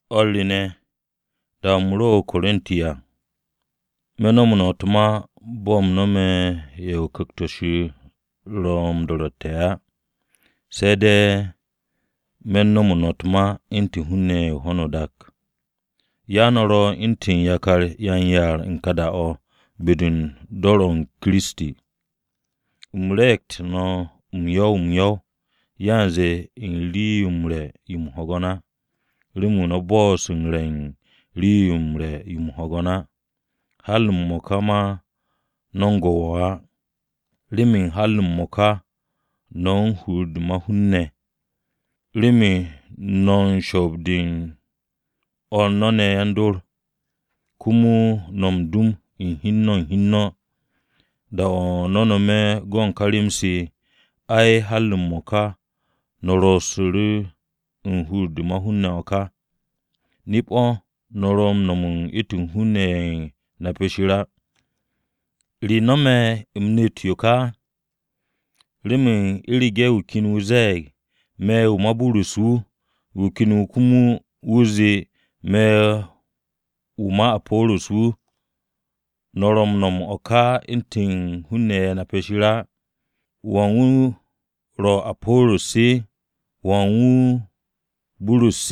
O̱r re ne̱, da-o̱ u̱m ro o-Korinti à, me̱ nomo no̱ u̱t-ma bo̱ u̱m nome̱ ye̱ Ku̱kt-o ro̱ m-do̱ru̱tte̱ á, se̱ de̱ me̱ u̱n nomo no̱ u̱t-ma u̱ntu̱n hun-ne̱ ye̱ u̱n ho̱no o-dak. Ya no̱ ro u̱ntu̱n yakar yan-yaar u̱n ka da-o̱, be-de u̱n dor Kiristi. U̱m re̱e̱gtu̱tu̱ no̱ m-yo̱w m-yo̱w yanze u̱n rii-yo m-re̱ yo m-hwo̱go̱n á, remen no̱ bo'os re̱ u̱n rii-yo m-re̱ yo m-hwo̱go̱n á. Har m-mo̱ka ma no̱ u̱n go̱ wo̱o̱ á. Remen har m-mo̱ka no̱ u̱n hur-de ma-hun ne̱. Remen no̱ u̱n shoob-de u̱n o̱r no̱ ne̱ yan-dor, komo no̱ m-dum u̱n hi u̱n no̱ u̱n hi u̱n no̱. Da-o̱ no̱ nome̱ go̱n ka rem-se, ai har m-mo̱ka no̱ ro̱su̱ru̱ u̱n hur-de ma-hun ne̱ o̱ ka. Nip-o̱ no̱ ro̱ m-nom u̱ntu̱n hun-ne̱ ye̱ nape̱ Shir á. ¿Re nome̱ u̱m nept yo ka? Remen u̱rege̱ wu̱ ken wu̱ ze̱e̱g, “Me̱ wu̱ ma Burus wu̱,” wu̱ ken wu̱ komo wu̱ zee, “Me̱ wu̱ ma Apo̱ro̱s wu̱.” ¿No̱ ro̱ m-nom o̱ ka u̱ntu̱n hun-ne̱ ye̱ nape̱ Shir á? ¿Wan wu̱ ro̱ Apo̱ro̱s? ¿Wan wu̱ Burus?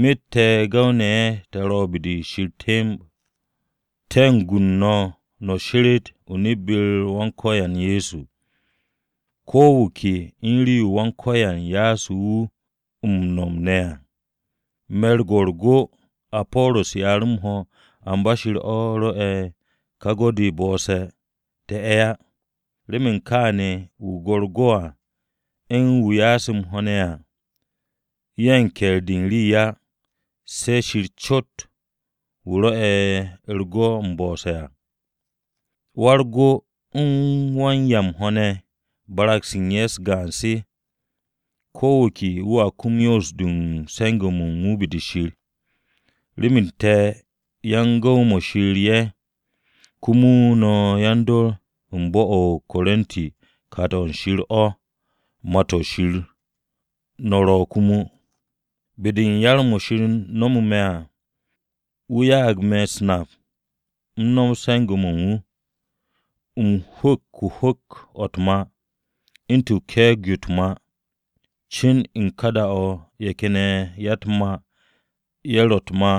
Myet te̱ gu̱w-ne̱ te̱ ro̱ be-de Shir temb. Te̱ u̱n gu no̱ no̱ sheret o-nip be-u̱r Wan-Ko̱yan Ye̱so. Ko̱ wu̱ ke u̱n rii-yo Wan-Ko̱yan ya'asu̱ wu̱ m-nom ne̱ à. Me̱ go u̱r-go, Apo̱ro̱s ya'u̱ m-ho̱, amba Shir o̱ rwo̱'e̱ ká go-de m-bo̱'o̱se̱, te̱ ye̱ á. Remen kaane̱ wu̱ go̱ u̱r-go à, u̱n wu̱ ya'e̱ m-ho̱ ne̱ à ye̱ u̱n ke̱e̱r-de u̱n rii á, se̱ Shir cot wu̱ rwo̱'e̱ ka u̱r-go m-bo̱'o̱se̱ à. Wa-u̱r-go u̱n wan-'ya m-ho̱ ne̱ barag-se u̱n ye̱ gaan-se. Ko wu̱ ke wu̱a kum 'yons-de u̱n se̱nge̱-mo̱ u̱n wu̱ be-de Shir. Remen te̱ yan-gu̱w-mo̱ Shir ye̱, komo no̱ yan-dor u̱n bo̱-o̱ o-Korinti kat-o̱ Shir o̱. Mà-to̱ Shir no̱ ro̱ komo. Be-de u̱n yar-mo̱ Shir nomo me̱ à, wu̱ ya'ag me̱ u̱s-nap u̱m nomot se̱nge̱-mo̱ u̱n wu̱. U̱m huk hwu̱k-o̱ u̱t-mà u̱ntu̱n ke̱e̱g-yo u̱t-mà, cin u̱n ka da-o̱ ye̱ ken ya-u̱t-mà ye̱ ro̱ u̱t-mà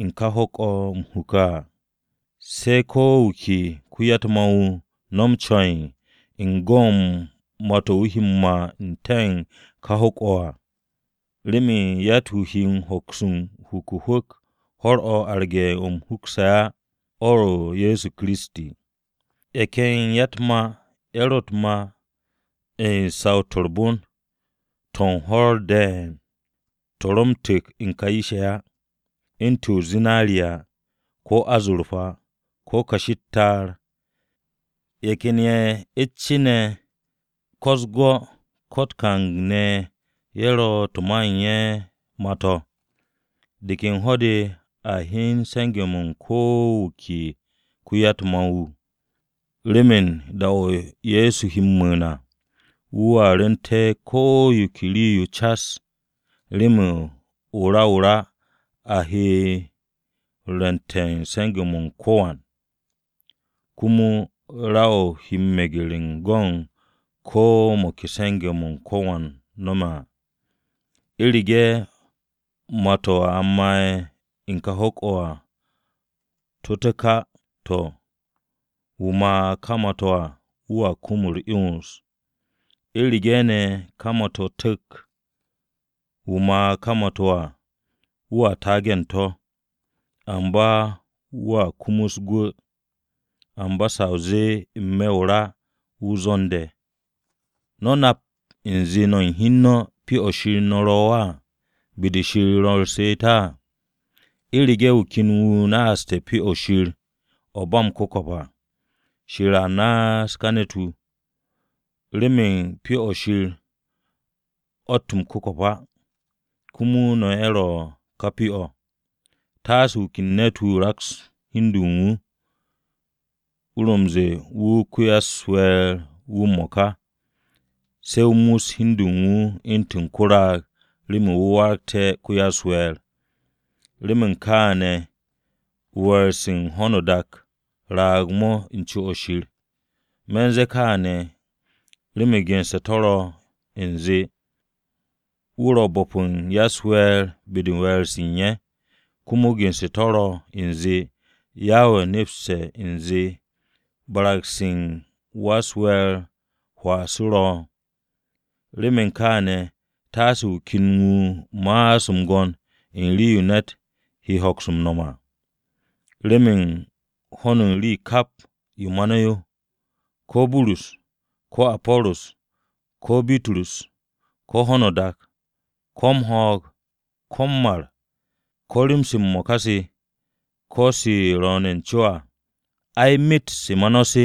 u̱n ka hwu̱k-o̱ u̱m huke̱ à. Se̱ ko̱ wu̱ ke ko-ya-u̱t-mà wu̱ nom ce̱e̱n u̱n go̱ u̱n mà-to̱ wu̱ he m-mà n-te̱ u̱n ká hwu̱k-o̱ à. Remen yatt-wu̱ he hoks u̱n huk u̱n hwu̱k ho̱r-o̱ arge̱ o̱ a hukse̱ á, o̱ ro̱ Ye̱so Kiristi. Ye̱ ken ya-u̱t-mà ye̱ ro̱ u̱n mà u̱t-mà u̱n saw-to̱ u̱r-bon u̱n to̱ u̱n hwo̱r ne̱ to̱ ro̱ m-tu̱k u̱n ka yish-ye̱ á u̱ntu̱n zinariya, ko̱ azorpa, ko̱ kashi u̱t-ta'ar, ye̱ ken ye̱, u̱t-ce ne̱, ko̱ u̱s-gwo̱, u̱t-kang ne̱ ye̱ ro̱ to̱ ma u̱n ye̱ mà-to̱. De ken ho̱-de a hyen se̱nge̱-mo̱ u̱n ko̱ wu̱ ke ko-ya-u̱t-mà wu̱. Remen da-o̱ Ye̱so he m-mu̱u̱n à, wu̱a rwu̱nte̱ ko yo ke rii-yo cas. Remen o-ra o-ra a he rwu̱nte̱ u̱n se̱nge̱-mo̱ u̱n ko̱wan, komo ra-o̱ he meger u̱n go̱ u̱n ko̱ mo̱ ke se̱nge̱-mo̱ ko̱wan nome̱ à. U̱rege̱ mà-to̱ a ma'e̱ u̱n ká hwu̱k-o̱ à to̱ tu̱k á, to̱, wu̱ mà ká ma-to̱ à wu̱a kum u̱r-'yons. U̱rege̱ ne̱ ká mà-to̱ tu̱k, wu̱ mà ka mà-to̱ à wu̱ taagu̱te̱ u̱n to̱, amba wu̱a kumus gwu̱, amba sa o zee n-me̱ o-ra wu̱ zwo̱n-de. ¿No̱ nap u̱nze no̱ u̱n hi u̱n no̱ Pyo-o̱ Shir o̱ no̱ ro̱ á, be-de Shir ro̱ m-she'et? U̱rege̱ wu̱ ken ne̱t-wu̱ naaste̱ Pyo-o̱ Shir o̱ ro̱ ba m-ku̱ko̱p à, Shir a naas ka ne̱t-wu̱. Remen Pyo-o̱ Shir o̱tt m-ku̱ko̱p á, komo no̱ ye̱ ro̱ ka Pyo-o̱. Taase ko̱ wu̱ ke ne̱t-wu̱ raks hi u̱n de u̱n wu̱, wu̱ ro̱ m-ze̱e̱ wu̱ ko-ya-u̱s-we̱e̱r wu̱ m-mo̱ka, se̱ wu̱ muss hi u̱n de u̱n wu̱ u̱ntu̱n ko-raag remen wu̱ waragté̱ ko-ya-u̱s-we̱e̱r. Remen kaane̱ we̱e̱r-se u̱n ho̱no o-dak raag-mo̱ u̱n co-o̱ Shir. Me̱ u̱n ze̱e̱ kaane̱, remen gense̱ to̱ ro̱ u̱nze, “Wu̱ ro̱ u̱n bo̱p u̱n ya-u̱s-we̱e̱r be-de u̱n we̱e̱r-se u̱n ye̱.” Komo gense̱ to̱ ro̱ u̱nze, “Yawe nepste̱ u̱nze barag-se u̱n ya-u̱s-we̱e̱r hwaa-se ro̱.” Remen kaane̱, taase wu̱ ken wu̱ ma'as m-gwo̱n u̱n rii-yo ne̱t he hoks m-nom à! Remen hon u̱n rii kap yo ma no̱ yo: Ko̱ Burus, ko̱ Apo̱ro̱s, ko̱ Bitrus, ko̱ ho̱no o-dak, ko̱ m-ho̱o̱g, ko̱ m-mar, ko̱ rem-se m-mo̱ka se, ko̱ u̱n se ro̱o̱ne̱ u̱-co à, ai myet se ma no̱ se,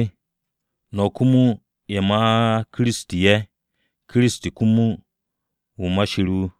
no̱ komo ye̱ ma Kiristi ye̱, Kiristi komo wu̱ Shir wu̱.